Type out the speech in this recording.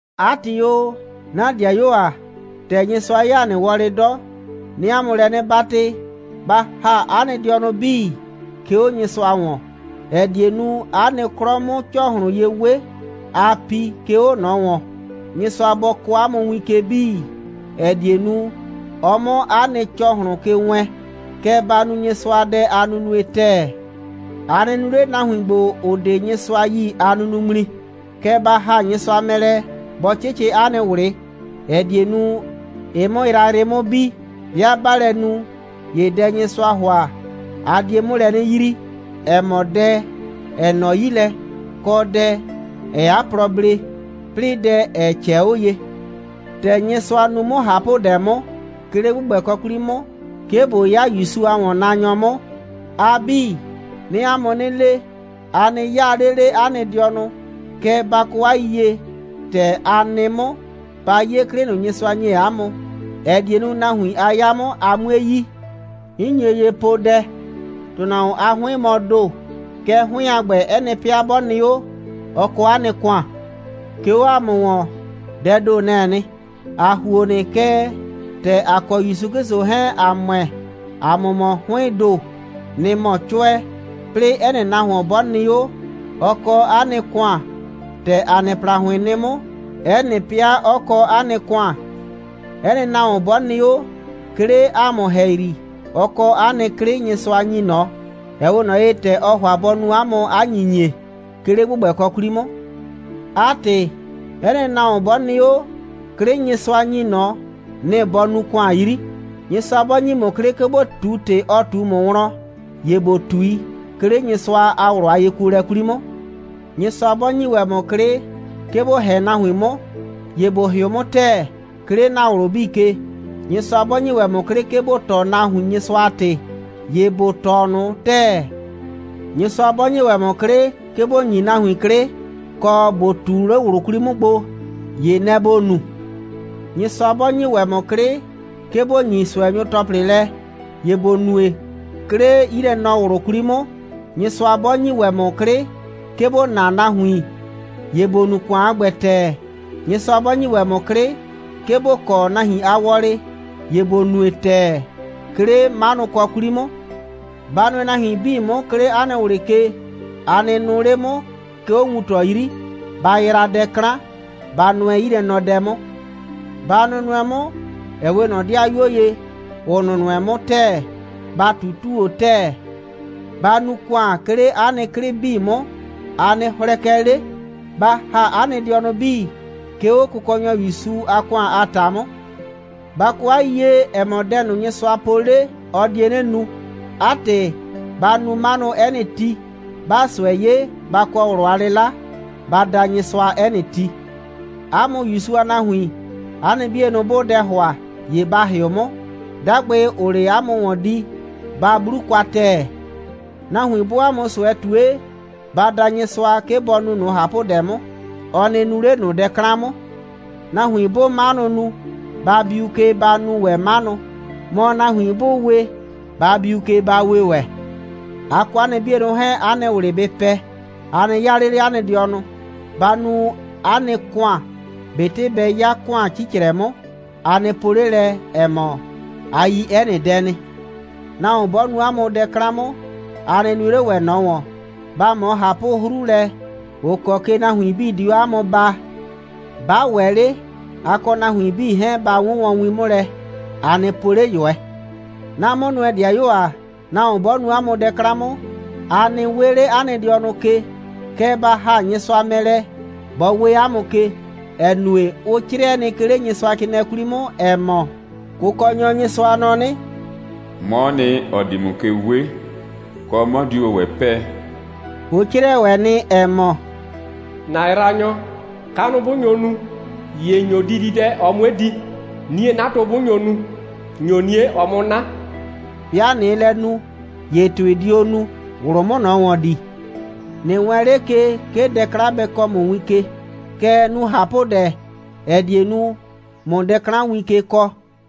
'A ‑tɩ o, 'na 'dɩayuo ‑a, ‑tɛ Nyɩsʋa 'ye ‑a nɩ wɔlɩ 'dɔ, 'nɩɩ 'a mʋ lɛ 'nɩ 'batɩ, ba ‑ha 'a nɩ dɩɔnʋ 'bii, 'ke 'o Nyɩsʋa ‑wɔn, ‑ɛ die nu, 'a nɩ 'klɔ 'mʋ ‑cɔhlʋn ye 'we, aa pi, 'ke 'o ꞊nɔ ‑wɔn. Nyɩsʋa bɔ kɔɔ 'a mʋ win ke 'bii, ‑ɛ die nu, ɔ 'mʋ 'a nɩ ‑cɔhlʋn ke wɛɛn. Kɛ ba nu Nyɩsʋadɛ a nunue ‑tɛɛ. A nɩ nu 'le nahuin ‑gbo, ‑ʋ 'de Nyɩsʋa yi a nunuŋmli, kɛɛ, ba ‑ha Nyɩsʋa mɛ lɛ, bɔ 'cɩcɩ 'a nɩ ꞊wlɩ, ‑ɛ die nu, ɩ 'mʋ yrayrɩ 'mʋ bi. 'Bɩa 'baa lɛ nu, ‑ye dɛ, Nyɩsʋaa ‑hʋa, a die 'mʋ lɛ 'nɩ yrii, ‑ɛ mɔ dɛ, ‑ɛ nɔ 'yi lɛ, kɔ dɛ, ‑ɛɛ 'a plɔ blee, 'plɩɩ dɛ, ‑ɛ ꞊cɛɛ 'o ye. ‑Tɛ Nyɩsʋa nu 'mʋ ꞊hapʋdɛ 'mʋ, 'ke 'le ‑gbʋgbɛkɔ 'kwli 'mʋ, 'ke ꞊bo 'ya ‑Yusu a ‑wɔnnaanyɔ 'mʋ, a 'bii, 'nɩɩ 'a mʋ 'nɩ le: A nɩ 'yaa 'le 'le 'a nɩ dɩɔnʋ, kɛɛ, ba kɔ 'a yiyie, ‑tɛ a nɩ 'mʋ. Ba 'ye 'klɩ ꞊nʋ, Nyɩsʋa ‑nye 'a mʋ, ‑ɛ die nu, nahuin a 'ya 'mʋ, a 'mue yi. 'N nye ye poo dɛ. ‑Tʋnahuon a 'hʋɩn mɔ ‑do. Kɛɛ, 'hʋɩn a ‑gbɛ, 'ɛ nɩ 'pɩa 'bɔ nɩ 'o, ɔ kɔ 'a nɩ ‑kʋan. 'Ke 'o ‑a mʋ ‑wɔn, dɛɛ ‑do, nɛ‑ɛ nɩ. ‑A ‑huo nɩ, kɛɛ, ‑tɛ ‑a kɔ ‑Yusu 'Klɩsʋ 'hɛɛn ‑a ‑mʋɛ, ‑a mʋ mɔ 'hʋɩɩn ‑do. Nɩ‑ mɔ 'cʋɛ. 'Plɩɩ, 'ɛ nɩ nahuon 'bɔ nɩ 'o, ɔ kɔ 'a nɩ ‑kʋan, ‑tɛ ‑a nɩ ‑plahʋɩn nɩ 'mʋ, 'ɛ nɩ 'pɩa 'ɔ kɔ 'a nɩ ‑kʋan. 'Ɛ nɩ nahuon 'bɔ nɩ 'o, 'ke 'le ‑a mʋ ‑hɛyri, ɔ kɔ 'a nɩ 'klɩ, Nyɩsʋa ‑nyi ꞊nɔ, ‑ɛ 'we ꞊nɔ ye, ‑tɛ ɔ ‑hʋa bɔ nu ‑a mʋ 'a ‑nyinyie, 'ke 'le ‑gbʋgbɛkɔ 'kwli 'mʋ. 'A ‑tɩ, 'ɛ nɩ nahuon 'bɔ nɩ 'o, 'klɩ, Nyɩsʋa ‑nyi ꞊nɔ, nɩ‑ bɔ nuu 'a ‑kʋan 'yri. Nyɩsʋa 'bɔ ‑nyi ‑mʋ 'klɩ, 'ke ‑bo ꞊tu ‑tɩ, ɔ ꞊tu ‑mʋ wlɔn, ‑ye ‑bo ꞊tui, 'ke 'le Nyɩsʋa a ꞊wlʋ a yekuolɛ 'kwli 'mʋ. Nyɩsʋa 'bɔ ‑nyi ‑wɛ ‑mʋ 'klɩ, 'ke ‑bo ‑hɛ nahuin 'mʋ, ‑ye ‑bo ‑hɩʋ 'mʋ ‑tɛɛ, 'ke 'le ‑na ꞊wlʋ 'bii ke. Nyɩsʋa 'bɔ ‑nyi ‑wɛ ‑mʋ 'klɩ, 'ke ‑bo tɔɔ nahuin Nyɩsʋa a ‑tɩ, ‑ye ‑bo tɔɔ ꞊nʋ ‑tɛɛ. Nyɩsʋa 'bɔ ‑nyi ‑wɛ ‑mʋ 'klɩ, 'ke ‑bo ‑nyi nahuin 'klɩ, kɔ ‑bo ꞊tu 'le ꞊wlʋ 'kwli 'mʋ gbo, ‑ye nɛ‑ ‑bo nu. Nyɩsʋa 'bɔ ‑nyi ‑wɛ ‑mʋ 'klɩ, 'ke ‑bo ‑nyi ꞊sʋɛnyʋ ‑tɔplɩ lɛ, ‑ye ‑bo nue, 'ke 'le 'yilɛnɔ꞊wlʋ 'kwli 'mʋ. Nyɩsʋa 'bɔ ‑nyi ‑wɛ ‑mʋ 'klɩ, 'ke ‑bo naa nahuin, ‑ye ‑bo nu ‑kʋan a ‑gbɛ ‑tɛɛ. Nyɩsʋa 'bɔ ‑nyi ‑wɛ ‑mʋ 'klɩ, 'ke ‑bo kɔ nahuin a wɔlɩ, ‑ye ‑bo nue ‑tɛɛ, 'ke 'le 'manʋkɔ 'kwli 'mʋ. Ba nʋɛ nahuin 'bii 'mʋ, 'ke 'le 'a nɩ ꞊wlɩ ke. A nɩ nʋʋ 'le 'mʋ, 'ke 'o wuntɔ 'yri. Ba yraa dɛ 'klan. Ba nʋɛ 'yilɛnɔdɛ 'mʋ. Ba nʋnʋɛ 'mʋ, ‑ɛ 'we ꞊nɔ 'dɩayuo ye, ‑ʋ nʋnʋɛ 'mʋ ‑tɛɛ. Ba ꞊tutuu 'o ‑tɛɛ. Ba nu ‑kʋan, 'ke 'le 'a nɩ 'klɩ 'bii 'mʋ. A nɩ hlɛkɛ 'le. Ba ‑ha 'a nɩ dɩɔnʋ 'bii, 'ke 'o Kʋkɔnyɔ ‑Yusu a ‑kʋan a ‑ta 'mʋ. Ba kɔ 'a yiyie, ‑ɛ mɔ, dɛ Nyɩsʋa po 'le, ɔ die 'nɩ nu. 'A ‑tɩ, ba nu 'manʋ 'ɛ nɩ ti. 'Baa ꞊sʋɛ 'ye, ba kɔ ꞊wlʋ a 'lɩla. Ba da Nyɩsʋa 'ɛ nɩ ti. 'A mʋ ‑Yusu a nahuin, 'a nɩ 'bienʋ, 'bʋʋ dɛ ‑hʋa, ‑ye ba ‑hɩʋ 'mʋ. 'Dagbɩ, ‑ʋʋ 'le 'a mʋ ‑wɔn di, ba 'blu kwa ‑tɛɛ. Nahuin 'bʋʋ 'a mʋ ꞊sʋɛ ꞊tue, ba da Nyɩsʋa, 'ke bɔ nu ꞊nʋ ꞊hapʋdɛ 'mʋ, ɔ nɩ nu 'le ꞊nʋ dɛ 'klan 'mʋ. Nahuin 'bʋʋ 'manʋ nu, ba biu ke, ba nu ‑wɛ 'manʋ. Mɔ, nahuin 'bʋʋ we, ba biu ke, ba we ‑wɛ. A kɔ 'a nɩ 'bienʋ 'hɛɛn, 'a nɩ ꞊wlɩ bɩ pɛ. A nɩ 'yaa 'le 'le 'a nɩ dɩɔnʋ. Ba nu 'a nɩ ‑kʋan, ꞊betɩ bɛ 'ya ‑kʋan 'cicrɛ 'mʋ. A nɩ po 'le lɛ, ‑ɛ mɔ, a yi 'ɛ nɩ dɛ nɩ. Nahuon 'bɔ nu 'a mʋ dɛ 'klan 'mʋ, a nɩ nue 'le ‑wɛ ꞊nɔ ‑wɔn. Ba ꞊mɔ ꞊hapʋ'hru lɛ, ‑ʋ kɔ ke nahuin 'bii di 'o 'a mʋ baa. 'Ba ‑wɛ 'le, a kɔ nahuin 'bii 'hɛɛn, ba 'wʋnwɔn win 'mʋ lɛ, a nɩ po 'le ꞊yʋɛ. 'Na 'mʋnʋɛ‑dɩayuo ‑a, nahuon 'bɔ nu 'a mʋ dɛ 'klan 'mʋ, a nɩ 'we 'le 'a nɩ dɩɔnʋ ke, kɛɛ, ba ‑ha Nyɩsʋa mɛ lɛ, bɔ 'we 'a mʋ ke, ‑ɛ nue, ʋ 'crɩɛ nɩ, 'ke 'le Nyɩsʋacrɩɩnɩɛ 'kwli 'mʋ, ‑ɛ mɔ: «Kʋkɔnyɔ Nyɩsʋa nɔ 'nɩ: 'Mɔɔ nɩ, ‑ɔ di ‑mʋ ke 'we, kɔ, 'mɔ diu ‑wɛ 'pɛɛ.» Ʋ 'crɩɛ ‑wɛ nɩ, ‑ɛ mɔ: «‑Na yraanyɔ, kanʋ 'bʋ nyo nu, ‑ye ‑nyo dididɛ, ɔ 'mue di, 'nie'natʋ 'bʋ nyo nu, ‑nyo 'nie, ɔ 'mʋ 'na.» 'Bɩa ꞊nɩɩ lɛ nu, ‑ye ‑tʋɩ dio nu, ꞊wlʋ 'mʋ ꞊nɔ ‑wɔn dii. ꞊Nɩ wɛɛn 'le ke, 'ke dɛ 'klan bɛ kɔɔ ‑mʋ win ke, kɛɛ, nu ꞊hapʋdɛ, ‑ɛ die nu, ꞊mʋ dɛ 'klan win ke kɔɔ.